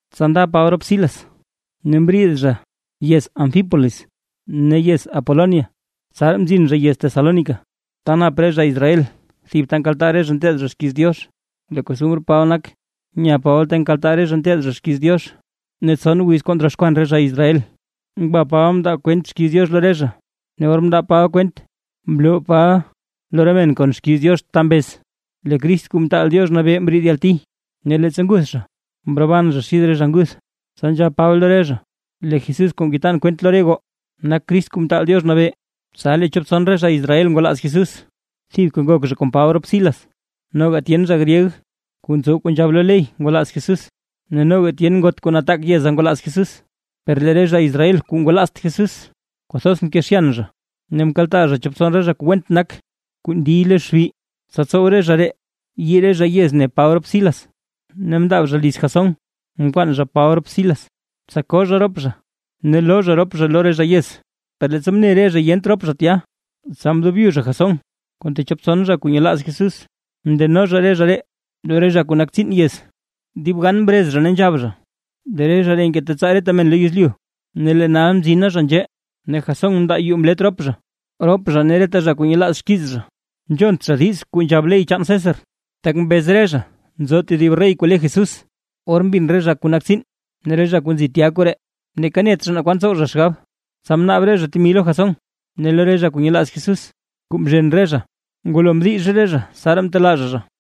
Tsa nda Paba rop Silas ne mriid zha yez Anfípolis ne yez Apolonia, tsaraa mzin zha yez Tesalónica, ta nap re zha Israel thib ta nkaltaa zha nteed zha xkiiz Diox. Lee costumr Paba nak, nya Paba ta nkaltaa re zha nteed zha xkiiz Diox, ne tson wiz kuu ndroxkwan re zha Israel, ngwa Paba mndaa kwent xkiiz Diox lo re zha. Ne or mndaa Paba kwent mloo Paba lo re men kon xkiiz Diox ta mbez: Lee Crist Kuu Mtaal Diox Nabee mbriid yalti, ne leettsa nguth zha, mroban zha xid re zha nguth. Tsa nzhab Paba lo re zha: ―Leeka Jesús kuu ngetan kwent lo re goo nak Crist Kuu Mtaal Diox Nabee. Tsa lee chop tson re zha Israel kuu ngwalaaz Jesús, thibka ngok zha kon Paba rop Silas, noga tyen zha gryeg kuu ntsow kuu nzhab lo ley ngwalaaz Jesús, ne noga tyen ngot kuu nataak yeza ngwalaaz Jesús. Per lee re zha Israel kuu ngwalaazt Jesús, kwathoz mkezhyan zha, ne mkaltaa zha chop tson re zha kuu went nak kuu ndiy lo xbi, tsa tsow re zha ree yii re zha yez ne Paba rop Silas. Ne mndaab zha liz Jasón mkwaan zha Paba rop Silas, tsa koo zha rop zha ne loo zha rop zha lo re zha yez; per leettsa mne re zha yent rop zha tya, tsa mdobyu zha Jasón kon techop tson zha kuu nyelaaz Jesús, mndeno zha re zha ree lo re zha kuu nak tsiin yez, ne dib gan mrez re zha ne nzhab zha: ―¡Lee re zha ree ngetetsaa reta men lo yezlyu, ne lee nal mzina zha nzhee, ne Jasón mndaa yuu mlet rop zha! ¡Rop zha ne reta zha kuu nyelaaz xkiiz zha, nzhont zha diiz kuu nzhab ley chaan César, tak mbez re zha nzo tedib rey kuu le Jesús! Or mbin re zha kuu nak tsiin ne re zha kuu nzi tya koree, neeka net zha naa kwan tsow zha xgab. Tsa mnaab re zha temi lo Jasón ne lo re zha kuu nyelaaz Jesús, kuu mzhen re zha, ngwalo mdix re zha tsaraa mtelaa zha zha.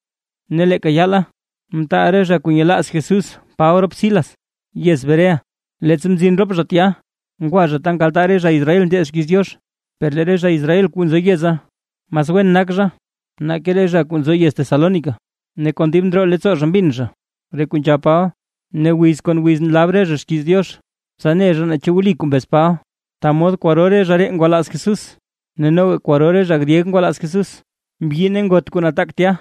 Ne leeka yaala mtaal re zha kuu nyelaaz Jesús Paba rop Silas yez Berea. Leettsa mzin rop zha tya, ngwa zha ta nkaltaa re zha Israel nteed xkiiz Diox. Per lee re zha Israel kuu nzo yeza, mas wen nak zha nake re zha kuu nzo yez Tesalónica, ne kon dib ndroo leettsoo zha mbin zha re kuu nzhab Paba, ne wiz kon wiz nlab re zha xkiiz Diox, tsa ne zha naa chu wli kuu mbez Paba. Ta mod kwaro re zha ree ngwalaaz Jesús. Ne noga kwaro re zha gryeg ngwalaaz Jesús, mbyi ne ngot kuu nataak tya.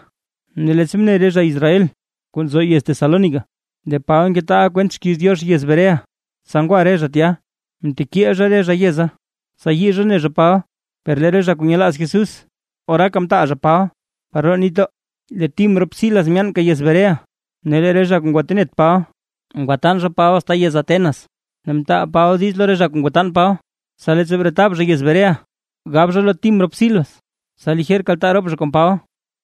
Ne leettsa mne re zha Israel kuu nzo yez Tesalónica lee Paba ngetaaʼa kwent xkiiz Diox yez Berea. Tsa ngwa re zha tya mtekiil zha re zha yeza, tsa yii zha ne Paba. Per lee re zha kuu nyelaaz Jesús, oraaka mtaal zha Paba par roo nitdoo, lee Tim rop Silas myaanka yez Berea. Ne lee re zha kuu ngwatenet Paba ngwatan zha Paba asta yez Atenas. Ne mtaal Paba diiz lo re zha kuu ngwatan Paba, tsa leettsa bretab zha yez Berea, gab zha lo Tim rop Silas tsa lijer kaltaa rop zha kon Paba.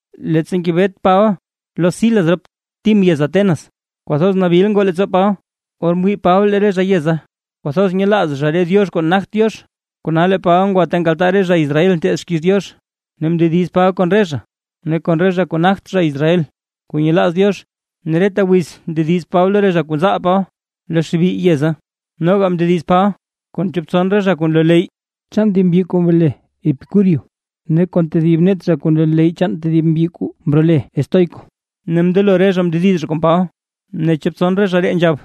Leettsa ngebet Paba lo Silas rop Tim yez Atenas, kwathoz nabil ngoo leettsoo Paba, or mwii Paba lee re zha yeza kwathoz nyelaaz zha re diox kuu nagt Diox. Kona lee Paba ngwa ta nkaltaa re zha Israel nteed xkiiz Diox ne mndediz Paba kon re zha ne kon re zha kuu nagt zha Israel kuu nyelaaz Diox, ne reta wiz ndediz Paba lo re zha kuu nzaal Paba lo xbi yeza. Noga mndediz Paba kon chop tson re zha kuu nloo leyy chaan thib mbyi kuu mrole Epicúrio ne kon tedib net zha kuu nloo leyy chaan thib mbyi kuu mrole Estoico, ne mndelo re zha mndediz zha kon Paba, ne chop tson re zha ree nzhab: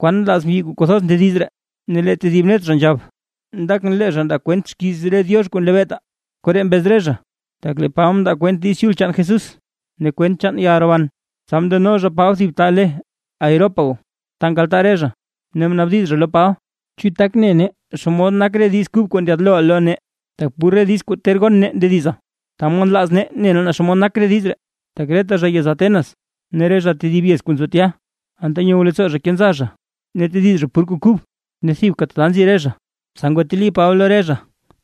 ―¿Kwan nlaaz mbyi kuu kwathoz ndediz ree ne? Ne lee tedib net zha nzhab: ―Ndakʼn lee zha ndaa kwent xkiiz re diox kuu nlebeetaa. Koree mbez re zha, tak lee Paba mndaa kwent Diiz Chul chaan Jesús ne kwent chaan yalroban. Tsa mndeno zha Paba thib ta le Areópago, ta nkaltaa re zha, ne mnaabdiz zha lo Paba: ―¿Chu tak ne nee naa xomod nak re diiz kub kuu ndyaad looʼa lo nee? Tak pur re diiz kuu ter gon nee ndediza, ta mod nlaaz nee ne nee naa xomod nak re diiz ree. Tak reta zha yez Atenas ne re zha tedib yez kuu nzo tya, anta nyow leettsoo zha kenza zha ne tediz zha pur kuu kub, ne thibka tata nzi re zha. Tsa ngwateli Paba lo re zha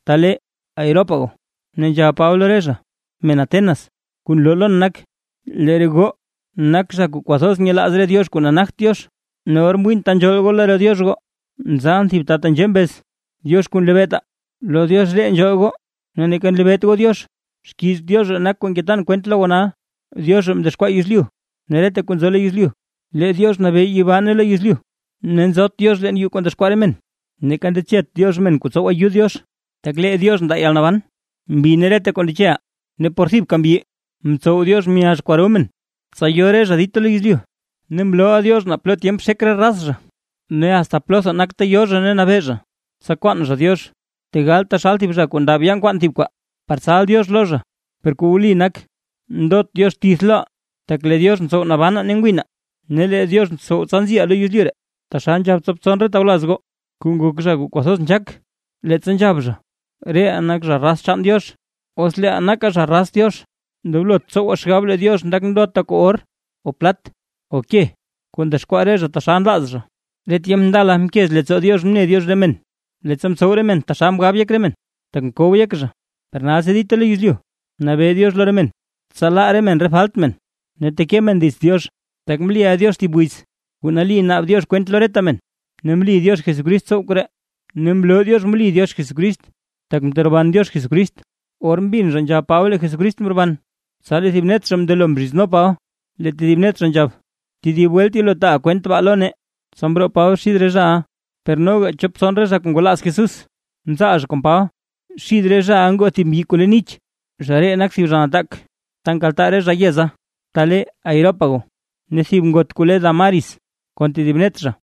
ta le Areópago, ne nzhab Paba lo re zha: ―Men Atenas, kuu nloo lon nak, lee re goo nak zha kuu kwathoz nyelaaz re diox kuu nagt Diox. Ne or mwiin re ta nzhool goo lo re diox goo, mzalʼn thib ta tenzhee mbez: “DIOX KUU NLEBEETAA”. Lo Diox ree nzhool goo ne neeka nlebeet goo Diox, xkiiz Diox ree nak kuu ngetan kwent lo goo nal. ’Diox ree mdexkwaa yezlyu ne reta kuu nzo lo yezlyu, lee Diox nabee yibaa ne lo yezlyu. Ne nzot Diox leen yuu kuu ndexkwaa re men, neeka ndechet Diox men kuu tsow ayud Diox, tak lee Diox ndaa yalnaban, mbi ne reta kuu ndecheʼaa. ’Ne por thibka mbyi mtsow Diox myazh kwaro men, tsa yo re zha dita lo yezlyu. Ne mlooʼa Diox naa plo tyemp xek re raz zha, ne asta plotha nak ta yo zha ne nabee zha. Tsa kwaan zha Diox, tegal taxal zha kuu ndaab yaa nkwaan thib kwaa par tsal Diox lo zha, per kuu wli nak, ndot Diox tith loʼaa. Tak lee Diox ntsow nabanaa ne ngwinaa, ne lee Diox ntsow, tsa nziʼaa lo yezlyu ree. Taxal nzhab chop tson re tawlaz goo kuu nak zha kuu kwathoz nzhaak, leettsa nzhab zha: “Reʼaa nak zha raz chaan Diox”. Kona os leeʼaa nakaa zha raz Diox, ndoblot tsowaa xgab lee Diox nak ndota kuu or, o plat, o ke, kuu ndexkwaa re zha taxal nlaaz zha. Re tyemp ndala mkez leettsoo Diox mne Diox re men, leettsa mtsow re men taxal mgab yek re men, tak mkow yek zha, per nalsi dita lo yezlyu, nabee Diox lo re men, tsa laa re men re falt men ne teke men dits Diox. Tak mliʼa Diox thib wiz, kuu nali naab Diox kwent lo reta men, ne mli Diox Jesucrist tsow koree, ne mloo Diox mli Diox Jesucrist tak mteroban Diox Jesucrist. Or mbin zha nzhab Paba lee Jesucrist mroban, tsa lee thib net zha mndelo mzhizno Paba, lee tedib net zha nzhab: ―Tedib welt yelo taaʼa kwent baa lo nee. Tsa mroo Paba xid re zhaʼa. Per noga chop tson re zha ngwalaaz Jesús, mzaal zha kon Paba. Xith re zhaʼa ngoo thib mbyi kuu le Nich, zha ree nak thib zha nataak ta nkaltaa re zha yeza ta le Areópago, ne thib ngot kuu le Dámaris kon tedib net zha.